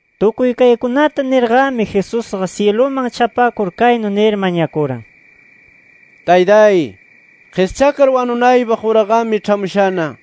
Tukuy kaykunata nirnaqami, Jesusqa syiluman chapakur kaynu nir mañakuran: “Taytay, qischakar wanunaypaq uraqami ĉhamushana.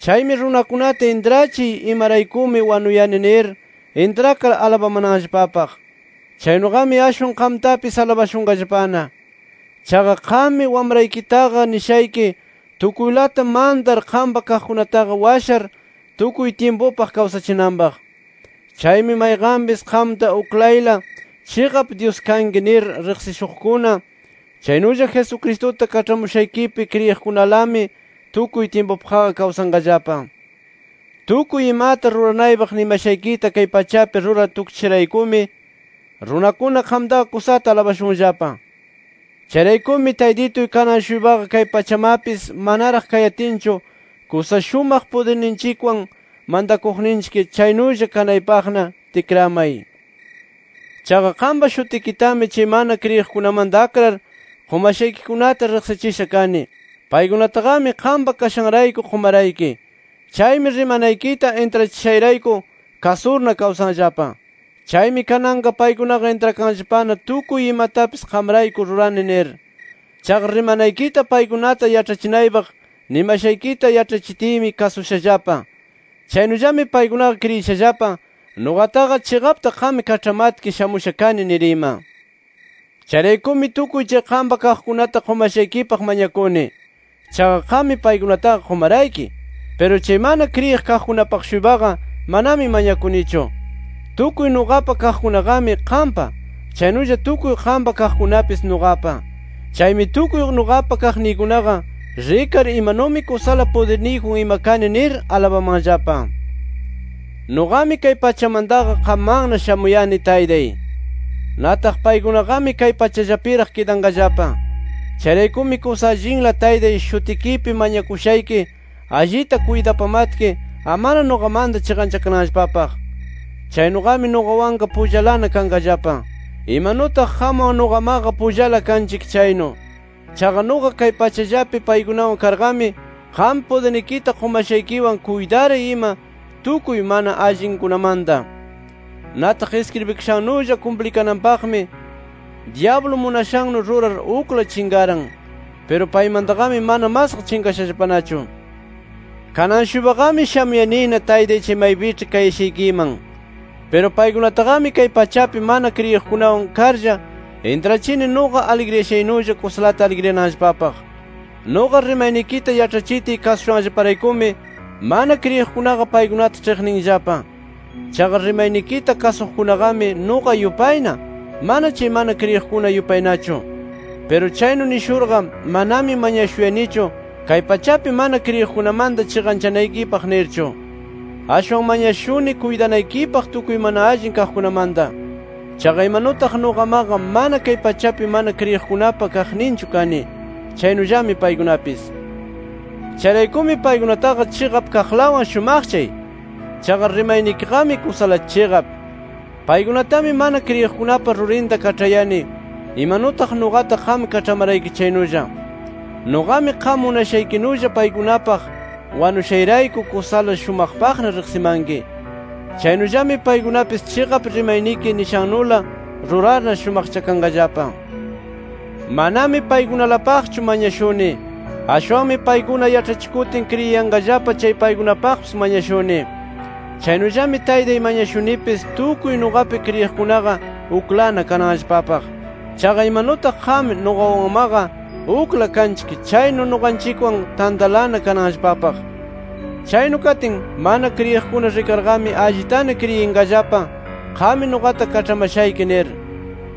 Chaymi, runakunata intrachiy, imaraykumi wanuyani nir intrakar alabamananllapapaq. Chaynuqami ashwan qamtapis alabashunqallapana. Chaqa qammi Wamraykitaqa nishayki, tukuylata mantar qampa kaqkunataqa washar, tukuy tyimpupaq kawsachinanpaq. Chaymi mayqanpis qamta uklayla chiqap Dyus kanki nir riqsishuqkuna, chaynulla Jesucristuta kaĉhamushaykipi kriyiqkunalami tukuy tyimpupaqqa kawsanqallapa. “Tukuy imata ruranaypaq nimashaykita kay pachapi rurar tukchishayraykumi, runakuna qamtaqa kusata alabashunllapa. Chayraykumi Taytituy kanan-shuypaqa kay pachamapis manaraq kayatinchu kusa shumaq pudirninchikwan mantakuqninchik, chaynulla kanaypaqna tikramay. “Chaqa qampa shutikitami, chay mana kriyiqkunamanta akrar qumashaykikunata riqsichisha kani. Paykunataqami, qampa kashanrayku qumarayki. Chaymi rimanaykita intrachishayrayku kasurna kawsanllapa. Chaymi kananqa paykunaqa intrakanllapana, tukuy imatapis qamrayku rurani nir. Chaqa rimanaykita paykunata yaĉhachinaypaq nimashaykita yaĉhachitiymi, kasushallapa. Chaynullami paykunaqa kriyishallapa, nuqataqa chiqapta qam kaĉhamatki shamusha kani nir ima. “Chayraykumi tukuy chay qampa kaqkunata qumashaykipaq mañakuni. Chaqa qammi paykunataqa qumarayki. Piru chay mana kriyiq kaqkunapaq-shuypaqa manami mañakunichu. Tukuy nuqapa kaqkunaqami qampa. Chaynulla tukuy qampa kaqkunapis nuqapa. Chaymi tukuy nuqapa kaqniykunaqa, rikar imanumi kusala pudirniyjun ima kani nir alabamanllapa. “Nuqami kay pachamantaqa, qammanna shamuyani Taytay. Nataq paykunaqami kay pachallapiraq kidanqallapa. Chayraykumi kusa allinla Taytay, shutikipi mañakushayki, allita kuytapamatki amana nuqamanta chiqanchakananllapapaq. Chaynuqami nuqawanqa pullalana kanqallapa, imanutaq qamwan nuqamaqa pullala kanchik chaynu. Chaqa nuqa kay pachallapi paykunawan karqami, qam pudirnikita qumashaykiwan kuytaray ima tukuy mana allinkunamanta. Nataq iskribikashannulla kumplikananpaqmi, dyablu munashannu rurar ukla chinqaran. Piru paymantaqami mana masqa chinqashallapanachu. “Kanan-shuypaqami shamuyanina Taytay chay maypiĉhi kayashaykiman. Piru paykunataqami kay pachapi mana kriyiqkunawan karlla intrachini nuqa aligriyashaynulla kusalata aligriyananllapapaq. Nuqa rimaynikita yaĉhachitiy kasushanllaparaykumi, mana kriyiqkunaqa paykunata ĉhiqninllapa. Chaqa rimaynikita kasuqkunaqami nuqa yupayna, mana chay mana kriyiqkuna yupaynachu. Piru chaynu nishurqa, manami mañashuyanichu, kay pachapi mana kriyiqkunamanta chiqanchanaykipaq nirchu. Ashwan mañashuni kuytanaykipaq tukuy mana allin kaqkunamanta. Chaqa imanutaq nuqamaqa mana, kay pachapi mana kriyiqkunapa kaqninchu kani, chaynullami paykunapis. Chayraykumi paykunataqa chiqap kaqlawan shumaqchay. Chaqa rimaynikiqami kusala chiqap. Paykunatami mana kriyiqkunapa rurinta kaĉhayani, imanutaq nuqata qam kaĉhamarayki chaynulla. Nuqami qam munashaykinulla paykunapaq wanushayrayku kusala shumaqpaqna riqsimanki. Chaynullami paykunapis chiqap rimayniki nishannula rurarna, shumaqchakanqallapa. “Manami paykunalapaqchu mañashuni. Ashwanmi paykuna yaĉhachikutin kriyiyanqallapa chay paykunapaqpis mañashuni. Chaynullami Taytay mañashunipis tukuy nuqapi kriyiqkunaqa uklana kananllapapaq. Chaqa imanutaq qam nuqawanmaqa ukla kanchik chaynu, nuqanchikwan tantalana kananllapapaq. Chaynu katin, mana kriyiqkuna rikarqami allitana kriyinqallapa, qammi nuqata kaĉhamashayki nir.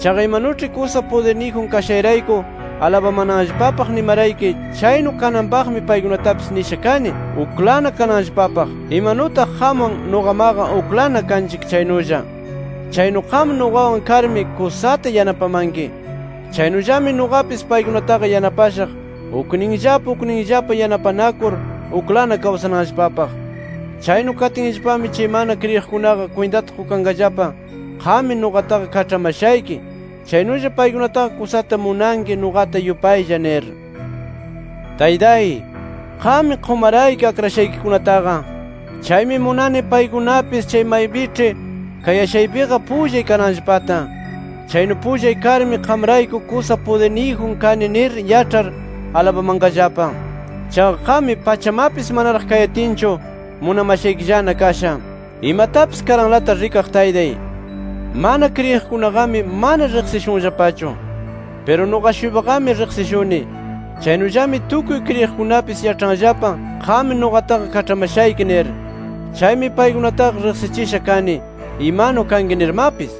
Chaqa imanuĉhi kusa pudirniyjun kashayrayku alabamananllapapaq nimarayki, chaynu kananpaqmi paykunatapis nisha kani, uklana kananllapapaq. Imanutaq qamwan, nuqamaqa uklana kanchik chaynulla. Chaynu qam nuqawan karmi kusata yanapamanki. Chaynullami nuqapis paykunataqa yanapashaq, ukninllapa ukninllapa yanapanakur, uklana kawsananllapapaq. Chaynu katinllapami chay mana kriyiqkunaqa kwintata qukanqallapa, qammi nuqataqa kaĉhamashayki, chaynulla paykunataqa kusata munanki nuqata yupaylla nir. “Taytay, qammi qumarayki akrashaykikunataqa. Chaymi munani paykunapis chay maypiĉhi kayashaypiqa pullay kananllapata. Chaynu pullay karmi qamrayku kusa pudirniyjun kani nir yaĉhar alabamanqallapa. Chaqa qammi, pachamapis manaraq kayatinchu munamashaykillana kasha. Imatapis karanlata rikaq Taytay, mana kriyiqkunaqami mana riqsishunllapachu. Piru nuqa-shuypaqami riqsishuni. Chaynullami tukuy kriyiqkunapis yaĉhanllapa, qam nuqataqa kaĉhamashayki nir. Chaymi paykunataqa riqsichisha kani, imanu kanki nirmapis.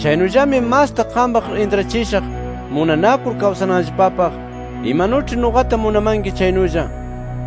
Chaynullami masta qampaq intrachishaq munanakur kawsananllapapaq imanuĉhi nuqata munamanki chaynulla.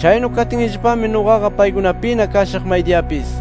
Chaynu katinllapami nuqaqa paykunapina kashaq maydiyapis”.